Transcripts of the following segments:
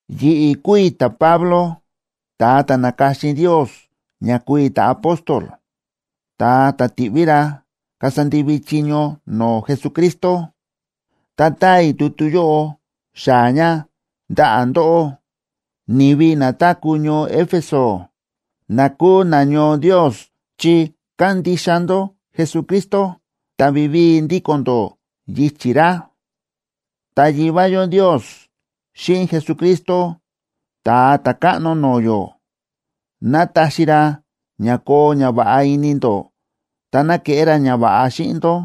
Yi̱ꞌi̱ kúu i̱ ta̱Pablo, ta̱a ta̱ na̱ka̱xin Ndios ña kúu i̱ ta̱apóstol, ta̱a ta̱ ti̱ꞌví ra kasa ndivi chiño no̱o̱ Jesucristo. Ta táa i̱ tutu yóꞌo xaa̱ ña ndaꞌa̱ ndóꞌó, ni̱vi na táku̱ ñoo Éfeso, na kúu nañoo Ndios chi kándixa ndó Jesucristo ta vivíi ndíko̱n ndó yichi̱ ra. Ta Yivá yó Ndios xíꞌin Jesucristo Ta̱a Ta̱káꞌno no̱o̱ yó, ná taxi ra ña koo ñava̱ꞌa ini ndó, ta ná keꞌé ra ñava̱ꞌa xíꞌin ndó.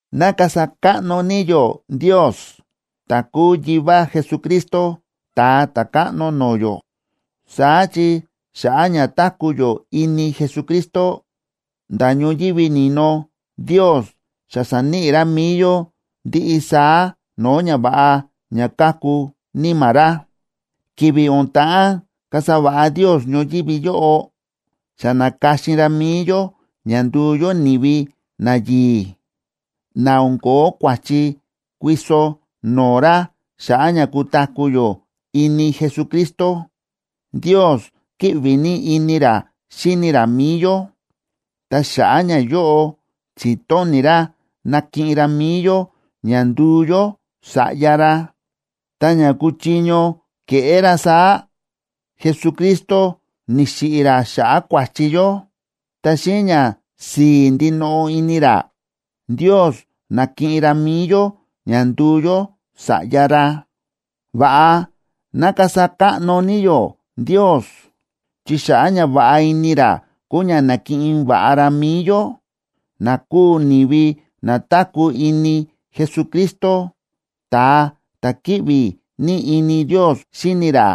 ¡Ná kasa káꞌno ní yó Ndios, ta̱ kúu Yivá Jesucristo, Ta̱a Ta̱káꞌno no̱o̱ yó! Saá chi xa̱ꞌa̱ ña táku̱ yó ini Jesucristo, nda̱ ñoyívi ni̱no Ndios xa sa̱níꞌi ra mi̱i yó ndiꞌi saá no̱o̱ ñava̱ꞌa ña káku Níma̱ ra. Ki̱vi̱ o̱n ta̱ꞌán kasa va̱ꞌa Ndios ñoyívi yóꞌo, xa na̱ka̱xin ra mi̱i yó ña nduu yó ni̱vi nayi̱i̱, na o̱n ko̱ó kua̱chi kuiso no̱o̱ ra xa̱ꞌa̱ ña kutaku̱ yó ini Jesucristo. Ndios kíꞌvi ní ini ra xíni ra mi̱i yó, ta xa̱ꞌa̱ ñayóꞌo, chi̱tóni̱ ra nakiꞌin ra mi̱i yó ña nduu yó sa̱ꞌya ra. Ta ña kuchiño keꞌé ra saá, Jesucristo ni̱xiꞌi̱ ra xa̱ꞌa̱ kua̱chi yó. Ta xíꞌin ñasi̱i̱ ndinoꞌo ini ra, Ndios na̱kiꞌin ra mi̱i yó ña ndu̱u yó sa̱ꞌya ra. Va̱ꞌa ná kasa káꞌno ní yó Ndios, chi xa̱ꞌa̱ ñava̱ꞌa ini ra kúu ña na̱kiꞌin va̱ꞌa ra mi̱i yó, na kúu ni̱vi na táku̱ ini Jesucristo, ta̱a ta̱ kíꞌvi ní ini Ndios xíni ra.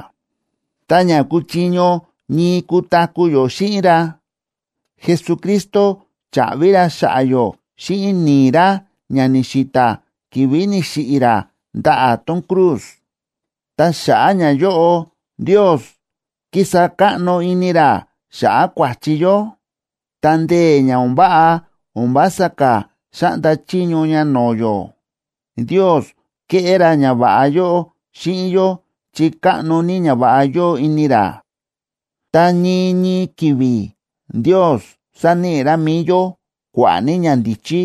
Ta ña kuchiño ñii kutaku̱ yó xíꞌin ra, Jesucristo cha̱ꞌvi ra xa̱ꞌa̱ yó xíꞌin ni̱i̱ ra ña ni̱xi̱ta̱ ki̱vi̱ ni̱xiꞌi̱ ra ndaꞌa̱ tón cruz. Ta xa̱ꞌa̱ ñayóꞌo Ndios kísa káꞌno ini ra xa̱ꞌa̱ kua̱chi yó, ta ndee̱ ña o̱n váꞌa o̱n vása ka̱ xáꞌnda chiño ña no̱o̱ yó. Ndios kéꞌé ra ñava̱ꞌa yóꞌo xíꞌin yó chi káꞌno ní ñava̱ꞌa yóo ini ra. Ta ñii ñii ki̱vi̱ Ndios sáníꞌi ra mi̱i yó kua̱ꞌa̱ ní ñandíchí,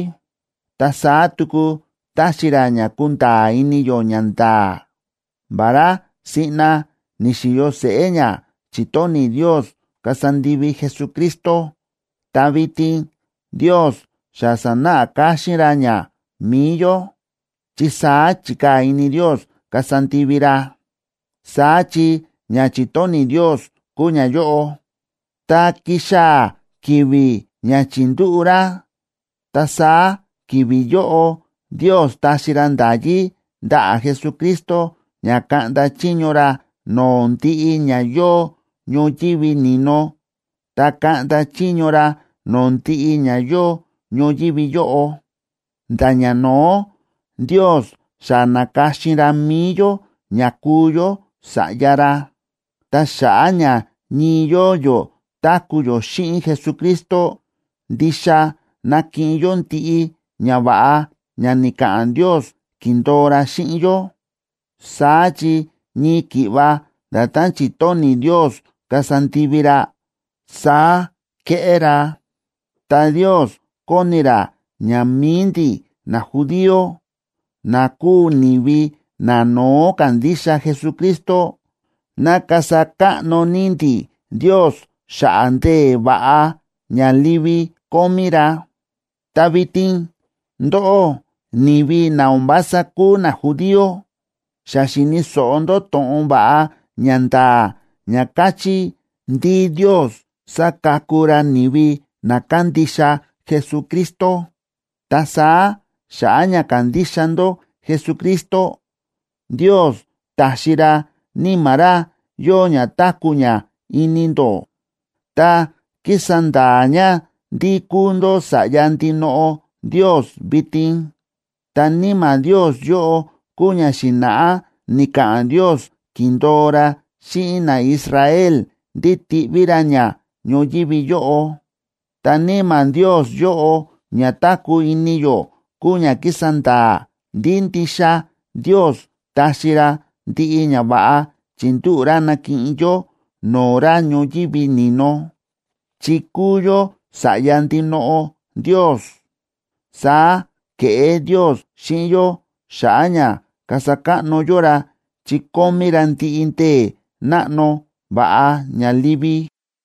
ta saá tuku táxi ra ña kunda̱a̱ ini yó ñanda̱a̱. Vará siꞌna ni̱xi̱yo seꞌé ña chi̱tóni̱ Ndios kasa ndivi Jesucristo, ta vitin Ndios xa sa̱náꞌa káxín ra ña mi̱i yó, chi saá chi̱kaa̱ ini Ndios kasa ndivi ra. Saá chi ña chi̱tóni̱ Ndios kúu ñayóꞌo: Tá kixaa̱ ki̱vi̱ ña chi̱ndúꞌu̱ ra, ta saá ki̱vi̱ yóꞌo Ndios taxi ra nda̱yí ndaꞌa̱ Jesucristo ña kaꞌnda chiño ra no̱o̱ ndiꞌi ña yóo ñoyívi ni̱no ta kaꞌnda chiño ra no̱o̱ ndiꞌi ña yóo ñoyívi yóꞌo. Nda̱ ñano̱ó Ndios xa na̱ka̱xin ra mi̱i yó ña kuu yó sa̱ꞌya ra. Ta xa̱ꞌa̱ ña ñii yóo yó táku̱ yó xíꞌin Jesucristo, ndixa nakiꞌin yó ndiꞌi ñava̱ꞌa ña ni̱ka̱ꞌa̱n Ndios ki̱ndo̱o ra xíꞌin yó. Saá chi ñii ki̱ꞌva nda̱tán chi̱tóni̱ Ndios kasa ndivi ra, saá kéꞌé ra. Ta Ndios kóni ra ña mi̱i ndi̱ najudío, na kúu ni̱vi nano̱ó ka̱ndixa Jesucristo, ná kasa káꞌno ní ndi̱ Ndios xa̱ꞌa̱ ndee̱ va̱ꞌa ña livi kómí ra. Ta vitin ndóꞌó, ni̱vi na o̱n vása kúu najudío xa xi̱ni̱ so̱ꞌo ndó to̱ꞌon va̱ꞌa ña nda̱a̱ ña káchí ndí Ndios sáka̱ku ra ni̱vi na kándixa Jesucristo. Ta saá xa̱ꞌa̱ ña ka̱ndixa ndó Jesucristo, Ndios ta̱xi ra Níma̱ ra yóo ña táku̱ ña ini ndó, ta kísa nda̱a̱ ña ndí kúu ndó sa̱ꞌya ndinoꞌo Ndios vitin. Ta Níma̱ Ndios yóꞌo kúu ña xi̱na̱ꞌá ni̱ka̱ꞌa̱n Ndios ki̱ndo̱o ra xíꞌin naIsrael ndí tiꞌví ra ña ñoyívi yóꞌo. Ta Níma̱ Ndios yóꞌo ña táku̱ ini yó kúu ña kísa nda̱a̱ ndí ndixa Ndios taxi ra ndiꞌi ñava̱ꞌa chi̱ndúꞌu̱ ra nakiꞌin yó no̱o̱ ra ñoyívi ni̱no, chi kúu yó sa̱ꞌya ndinoꞌo Ndios. Saá ke̱ꞌé Ndios xíꞌin yó xa̱ꞌa̱ ña kasa káꞌno yó ra chi kómí ra ndiꞌi ndee̱ náꞌno va̱ꞌa ña livi.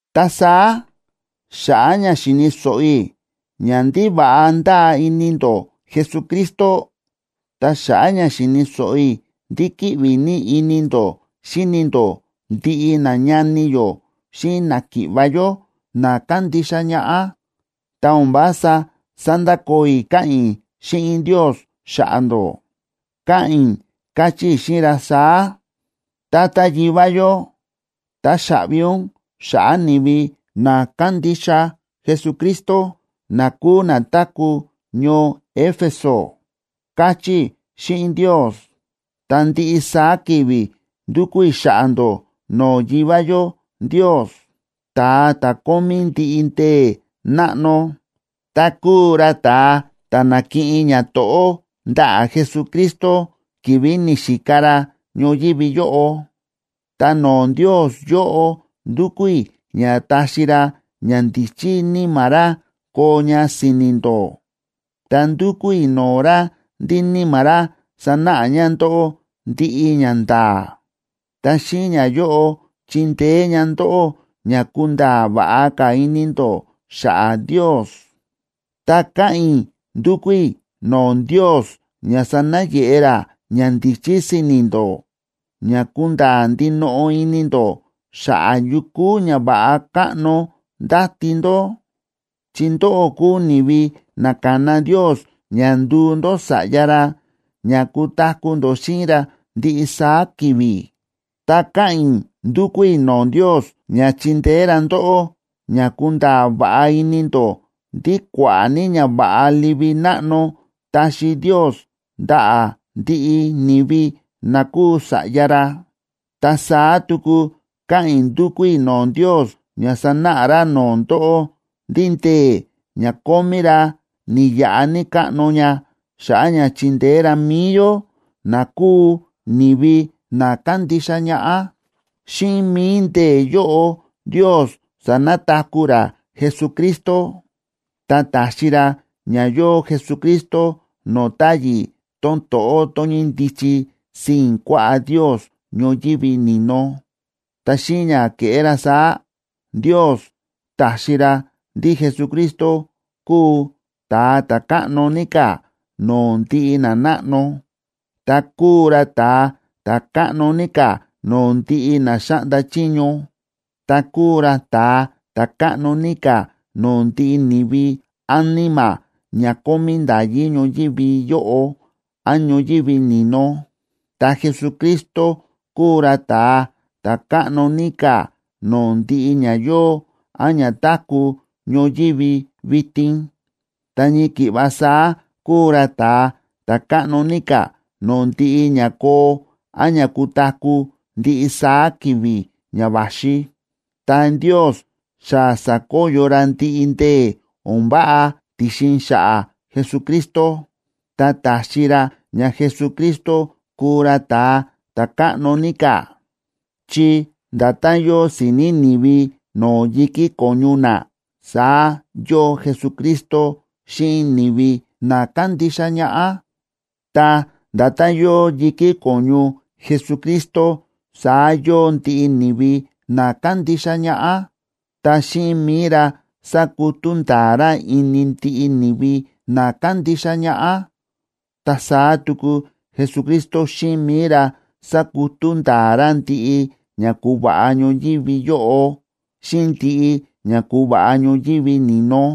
Ta saá xa̱ꞌa̱ ña xi̱ni̱ so̱ꞌo i̱ ña ndí va̱ꞌa ndáa ini ndó Jesucristo, ta xa̱ꞌa̱ ña xi̱ni̱ so̱ꞌo i̱ ndí kíꞌvi ní ini ndó xíni ndó ndiꞌi nañani yó xíꞌin náki̱ꞌva̱ yó na kándixa ñaꞌá, ta o̱n vása sándakoo i̱ káꞌa̱n i̱ xíꞌin Ndios xa̱ꞌa̱ ndó, káꞌa̱n i̱ káchí i̱ xíꞌin ra saá: “Tata Yivá yó, táxaꞌvi ún xa̱ꞌa̱ ni̱vi na kándixa Jesucristo na kúu na táku̱ ñoo Éfeso”, káchí i̱ xíꞌin Ndios. Ta ndiꞌi saá ki̱vi̱ ndúkú i̱ xa̱ꞌa̱ ndó no̱o̱ Yivá yó Ndios, ta̱a ta̱ kómí ndiꞌi ndee̱ náꞌno, ta kúu ra ta̱a ta̱ na̱kiꞌin ñato̱ꞌó ndaꞌa̱ Jesucristo ki̱vi̱ ni̱xika ra ñoyívi yóꞌo. Ta no̱o̱ Ndios yóꞌo ndúkú i̱ ña taxi ra ñandíchí Níma̱ ra koo ña si̱ni̱ ndó, ta ndúkú i̱ no̱o̱ ra ndí Níma̱ ra sanáꞌa ña ndóꞌó ndiꞌi ñanda̱a̱. Ta xíꞌin ñayóꞌo, chindeé ña ndóꞌó ña kunda̱a̱ va̱ꞌa ka̱ ini ndó xa̱ꞌa̱ Ndios. Ta káꞌa̱n i̱ ndúkú i̱ no̱o̱ Ndios ña sanayeꞌe ra ñandíchí si̱ni̱ ndó ña kunda̱a̱ ndinoꞌo ini ndó xa̱ꞌa̱ yu kúu ñava̱ꞌa káꞌno ndáti ndó, chi ndóꞌó kúu ni̱vi na ka̱na Ndios ña nduu ndó sa̱ꞌya ra ña kutaku̱ ndó xíꞌin ra ndiꞌi saá ki̱vi̱. Ta káꞌa̱n i̱ ndúkú i̱ no̱o̱ Ndios ña chindeé ra ndóꞌó ña kunda̱a̱ va̱ꞌa ini ndó ndí kua̱ꞌa̱ ní ñava̱ꞌa livi náꞌno taxi Ndios ndaꞌa̱ ndiꞌi ni̱vi na kúu sa̱ꞌya ra. Ta saá tuku káꞌa̱n i̱ ndúkú i̱ no̱o̱ Ndios ña sanáꞌa ra no̱o̱ ndóꞌó ndí ndee̱ ña kómí ra ni̱yaꞌa ní káꞌno ña xa̱ꞌa̱ ña chindeé ra mi̱i yó na kúu ni̱vi na kándixa ñaꞌá. Xíꞌin mi̱i ndee̱ yóꞌo, Ndios sa̱nataku̱ ra Jesucristo, ta ta̱xi ra ña yóo Jesucristo no̱o̱ táyi̱ tón to̱ꞌó tón ñíndichi sii̱n kuaꞌá Ndios ñoyívi ni̱no. Ta xíꞌin ña ke̱ꞌé ra saá, Ndios ta̱xi ra ndí Jesucristo kúu ta̱a ta̱ káꞌno ní ka̱ no̱o̱ ndiꞌi nanáꞌno, ta kúu ra ta̱a ta̱ káꞌno ní ka̱ no̱o̱ ndiꞌi na xáꞌnda chiño, ta kúu ra ta̱a ta̱ káꞌno ní ka̱ no̱o̱ ndiꞌi ni̱vi án níma̱ ña kómí nda̱yí ñoyívi yóꞌo án ñoyívi ni̱no. Ta Jesucristo kúu ra ta̱a ta̱ káꞌno ní ka̱ no̱o̱ ndiꞌi ña yóo án ña táku̱ ñoyívi vitin, ta ñii ki̱ꞌva saá kúu ra ta̱a ta̱ káꞌno ní ka̱ no̱o̱ ndiꞌi ña koo án ña kutaku̱ ndiꞌi saá ki̱vi̱ ña va̱xi. Ta Ndios xa sa̱koyo ra ndiꞌi ndee̱ o̱n váꞌa ti̱xin xa̱ꞌa̱ Jesucristo, ta ta̱xi ra ña Jesucristo kúu ra ta̱a ta̱káꞌno ní ka̱, chi nda̱tán yóo si̱ni̱ ni̱vi no̱o̱ yi̱kí ko̱ñu na, saá yóo Jesucristo xíꞌin ni̱vi na kándixa ñaꞌá. Ta nda̱tán yóo yi̱kí ko̱ñu Jesucristo saá yóo ndiꞌi ni̱vi na kándixa ñaꞌá. Ta xíꞌin mi̱i ra sákutú nda̱a̱ ra ini ndiꞌi ni̱vi na kándixa ñaꞌá. Ta saá tuku Jesucristo xíꞌin mi̱i ra sákutú nda̱a̱ ra ndiꞌi ña ku̱va̱ꞌa ñoyívi yóꞌo xíꞌin ndiꞌi ña ku̱va̱ꞌa ñoyívi ni̱no.